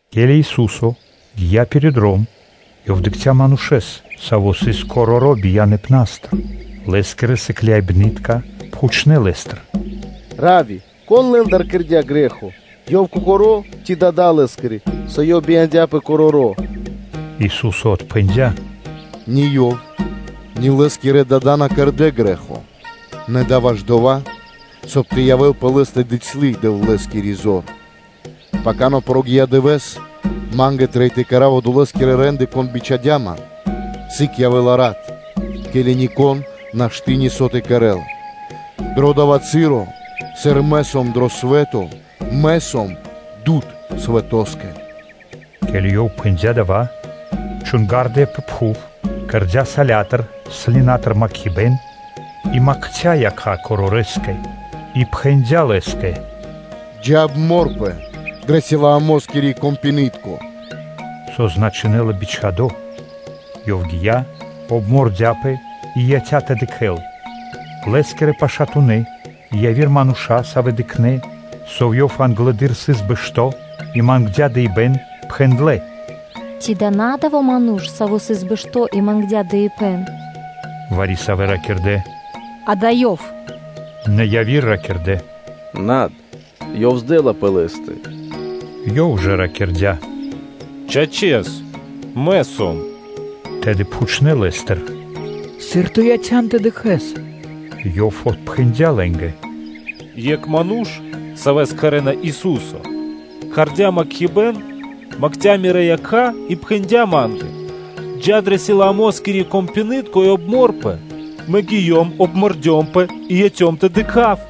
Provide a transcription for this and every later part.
Ке́ли Ису́со гия́ пиро́ дром, Ёв дыкхця́ манушэ́с, саво́ сыс короро́ бияныпнастыр. Лэ́скирэ сыкляибны́тка пхучнэ́ Лэ́стыр: “Равви! Кон лэ́ндыр кэрдя́ грэ́хо, ёв кокоро́, ци дада́ лэ́скирэ, со ёв бия́ндыя короро́?” Ису́со отпхэндя́: “Ни ёв, ни лэ́скирэ дада́ на кэрдэ́ грэ́хо, нэ дава́ исын ваш дова́, соб (кай) тэ явэ́л пэ лэ́стэ бицялы (дыцьлы) Дэвлэ́скири зор. Пака на прогия́ дывэ́с, Ма́нгэ трэй тэ кэра́в Одолэскирэ рэ́нды, Кон бичхадя́ Ман; сыг явэ́ла рат, ке́ли нико́н нашты́ нисо́ тэ кэрэ́л. Дро дава́ часо, сыр Мэ сом дро свэ́то, Мэ сом дуд (свэ́то) далэ́ свэтоскэ” Ке́ли Ёв пхэндя́ дава́, чунгардыя пэ пхув, кэрдя́ салятыр (слинатыр) макхибэн и макця якха́ корорэскэ, И пхэндя́ лэ́скэ: “Джа́, обморпэ дрэ Силоамоскири вэндэри́н (прудо)” /со значинэла “бичхадо́!”/. Ёв гия́, обмордяпэ и яця́ тэ дыкхэ́л. Лэ́скирэ пашатунэ́ и яви́р мануша́, савэ́ дыкхнэ́, со ёв англэды́р сыс короро́ бэшто́ и мангдя́ дыибэ́н, пхэндлэ́: “Ци да исын на одова́ ману́ш, саво́ сыс бэшто́ и мангдя́ дыибэ́н?” Вари-савэ́ ракирдэ́: “Дава́ ёв исын.” Нэ яви́р ракирдэ́: “Над, ёв здэла (подджа́ла) пэ лэ́стэ.” Ёв ж ракирдя́: “Чачэс, мэ сом.” Тэды пхучнэ́ лэ́стыр: “Сыр ту яця́н тэ дыкхэ́с?” Ёв отпхэндя́ лэ́нгэ: “Екх Ману́ш, Савэс кхарэ́на Ису́со, кэрдя́ макхибэн, макця мирэ́ якха́ и пхэндя́ ма́нгэ: ‘Джа́ дро Силоамоскиро компинытко и обморпэ’. Мэ гиём, обмордёмпэ и яцём тэ дыкха́в.”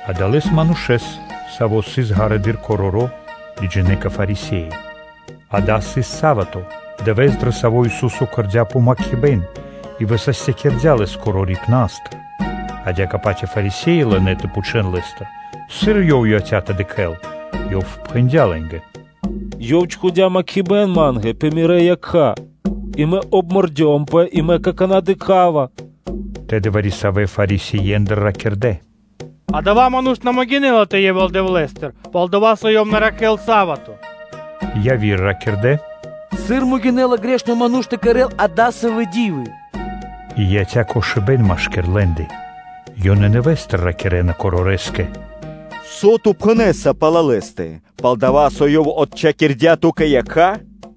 Адалэс манушэ́с, саво́ сыс ґарэдыр короро́, лыджинэ́ кэ Фарисе́и. Дава́ сыс са́вато, дывэ́с, дро саво́ Ису́со кэрдя́ помакхибэн и высастякирдя́ лэс корорипнастыр. Адя́кэ-паць и Фарисе́и лынэ́ тэ пхучэ́н Лэ́стыр, сыр ёв яця́ тэ дыкхэ́л. Ёв пхэндя́ лэ́нгэ: “Ёв чхудя́ макхибэн ма́нгэ пэ мирэ́ якха́ и мэ обмордёмпэ, и мэ какана́ дыкха́ва.” Тэды вари-савэ́ Фарисеендыр ракирдэ́: “Адава́ ману́ш на могинэ́ла тэ явэ́л Дэвлэ́стыр, пал-дова́ со Ёв на ракхэ́ла са́вато.” Яви́р ракирдэ́: “Сыр могинэ́ла грэхи́тко ману́ш тэ кэрэ́л дасавэ́ ди́вы?” – И яця́ кошыбэ́н машки́р лэ́ндэ. Ёнэ нэвэ́стыр ракирэ́на корорэскэ: “Со ту пхэнэ́са пал Лэ́стэ, пал-дова́ со Ёв отчхакирдя́ ту́кэ якха́?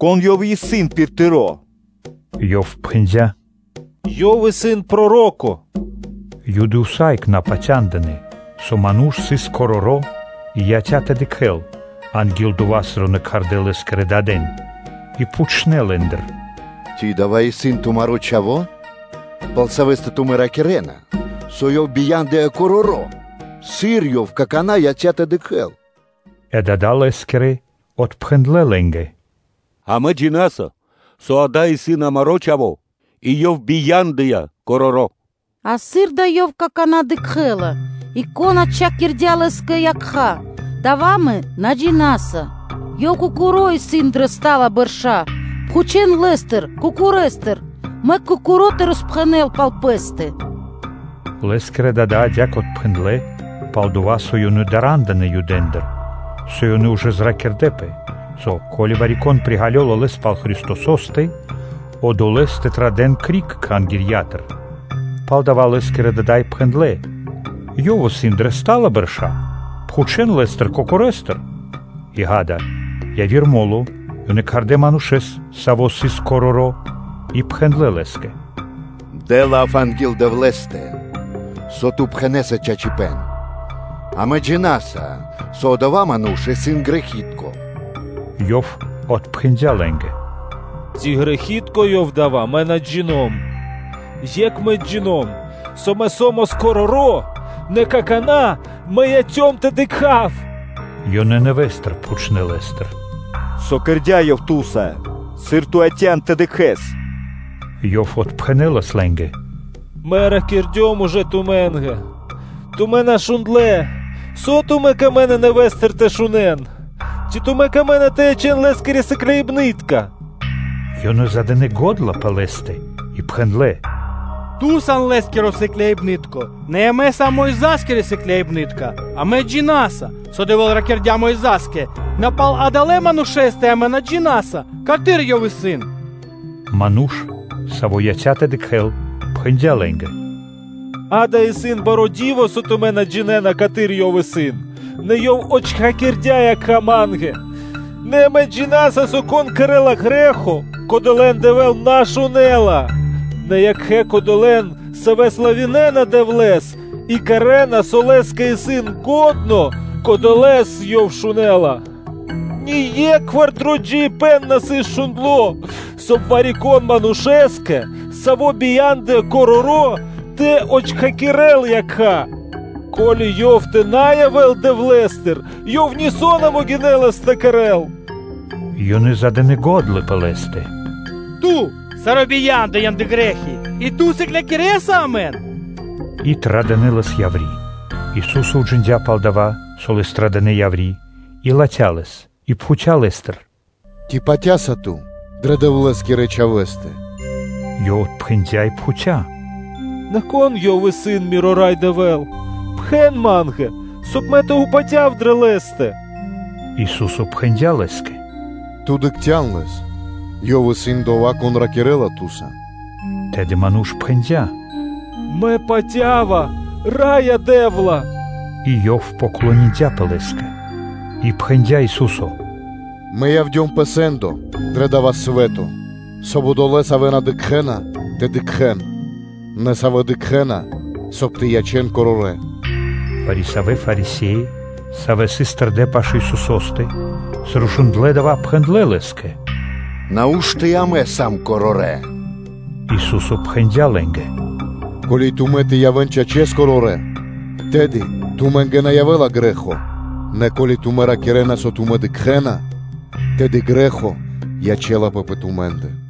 Кон Ёв исын пир тыро́?” Ёв пхэндя́: “Ёв исын проро́ко.” Юды усае́кх на патяндынэ́, со ману́ш сыс короро́ и яця́ тэ дыкхэ́л, анги́л дова́, сыр ёнэ кхардэ́ лэ́скирэ дадэн. И пхучнэ́ лэ́ндыр: “Ци дава́ исын тумаро́ чхаво́, пал савэ́стэ тумэ́ ракирэ́на, со ёв бия́ндыя короро́? Сыр ёв какана́ яця́ тэ дыкхэ́л?” Э дада́ лэ́скирэ отпхэндлэ́ лэ́нгэ: “Амэ джина́са, со ёв исын амаро́ чхаво́ и ёв бия́ндыя короро́; а сыр дава́ ёв какана́ дыкхэ́ла и, кон отчхакирдя́ лэ́скэ якха́, дава́ амэ на джина́са; ёв кокоро́ исын дрэ стала бэрша́, пхучэ́н лэ́стыр кокорэстыр, мэк ёв кокоро́ тэ роспхэнэл пал пэ́стэ.” Лэ́скирэ дада́ адя́кэ отпхэндлэ́, пал-дова́ со ёнэ дара́ндынэ Юдэндыр, со ёнэ ужэ зракирдэпэ, со ко́ли вари-кон приґалёла Лэс пал Христосо́стэ, одолэ́с тэ традэ́н криг Кхангирья́тыр. Палдава́ лэ́скирэ дада́ и пхэндлэ́: “Ёв исын дрэ стала бэрша́, пхучэ́н лэ́стыр кокорэстыр.” И ґа́да, яви́р мо́ло ёнэ кхардэ́ манушэ́с, саво́ сыс короро́, и пхэндлэ́ лэ́скэ: “Дэ лав анги́л Дэвлэ́стэ, со ту пхэнэ́са чачипэ́н: амэ джина́са, со Одова́ Ману́ш исын грэхи́тко.” Ёв отпхэндя́ лэ́нгэ: “Ци грэхи́тко Ёв исын, дава́ мэ на джино́м; екх мэ джино́м (джина́в), со мэ со́мас короро́, нэ какана́ мэ яцём тэ дыкха́в.” Ёнэ нэвэ́стыр пхучнэ́ лэ́стыр: “Со кэрдя́ Ёв ту́са? Сыр ту яця́н тэ дыкхэ́с?” Ёв отпхэнэ́лас лэ́нгэ: “Мэ ракирдём ужэ тумэ́нгэ, тумэ́ на шундлэ́: со тумэ́ камэ́на нэвэ́стыр тэ шунэ́н? Ци тумэ́ камэ́на тэ ячэн Лэ́скирэ сыкляибнытконэ́нца?” Ёнэ задынэ го́дла пэ лэ́стэ и пхэндлэ́: “Ту сан Лэ́скиро сыкляибны́тко, нэ амэ сам Мойза́скирэ сыкляибны́тка. Амэ джина́са, со Дэвэ́л ракирдя́ Мойзаса, нэ пал адалэ́ манушэ́стэ амэ на джина́са, каты́р Ёв исын?” Ману́ш, саво́ яця́ тэ дыкхэ́л, пхэндя́ лэ́нгэ: “Дава́ исын баро́ ди́во, со тумэ́ на джинэ́на, каты́р Ёв исын, нэ Ёв отчхакирдя́ якха́ ма́нгэ. Нэ амэ джина́са, со, кон кэрэ́ла грэ́хо, кодолэ́н Дэвэ́л на шунэ́ла, нэ екхэ кодолэ́н, савэ́ славинэна Дэвлэ́с и кэрэ́на, со Лэ́скэ исын лачхо́, кодолэ́с Ёв шунэ́ла. Ние́кхвар дро джиибэ́н на сыс шундло, соб (кай) вари-кон манушэ́скэ, саво́ бия́ндыя короро́, тэ отчхакирэл якха́. Ко́ли Ёв тэ на явэ́л Дэвлэ́стыр, Ёв нисо́ на могинэлас тэ кэрэ́л.” Ёнэ задынэ го́дла пэ лэ́стэ: “Ту саро́ бияндыян дрэ грэ́хи, и ци на ту сыклякирэса амэн?” И традынэ лэс яври́. Корорипэ́н дро Пэ́скиро Ду́хо (Фа́но) Ису́со уджиндя́ пал дава́, со лэс традынэ яври́, и латхя́ лэс и пхуця́ лэ́стыр: “Ци патя́са ту дрэ Дэвлэ́скирэ Чхавэ́стэ?” Ёв отпхэндя́ и пхуця́: “Нэ кон Ёв исын, миро Рай Дэвэ́л, пхэн ма́нгэ, соб (кай) мэ тэ упатяв дрэ Лэ́стэ?” Ису́со пхэндя́ лэ́скэ: “Ту дыкхця́н Лэс, Ёв исын Одова́, Кон ракирэ́ла ту́са.” Тэды ману́ш пхэндя́: “Мэ патя́ва, Раё Дэ́вла!” И ёв дыя́ паты́в Лэ́скэ. И пхэндя́ Ису́со: “Мэ явдём пэ сэ́ндо дрэ дава́ свэ́то, соб (кай) одолэ́, савэ́ на дыкхэ́на, тэ дыкхэ́н, нэ савэ́ дыкхэ́на, соб (кай) тэ ячэн корорэ́.” Вари-савэ́ Фарисе́и, савэ́ сыс тэрдэ́ пашы́л Исусо́стэ, сыр шундлэ́ дава́, пхэндлэ́ Лэ́скэ: “Нау́што и амэ сам корорэ́?” Ису́со пхэндя́ лэ́нгэ: “Ко́ли тумэ́ тэ явэ́н, чачэс, корорэ́, тэды тумэ́нгэ на явэ́ла грэ́хо; нэ ко́ли тумэ́ ракирэ́на, со тумэ́ дыкхэ́на, тэды грэ́хо ячэ́лапэ пэ тумэ́ндэ.”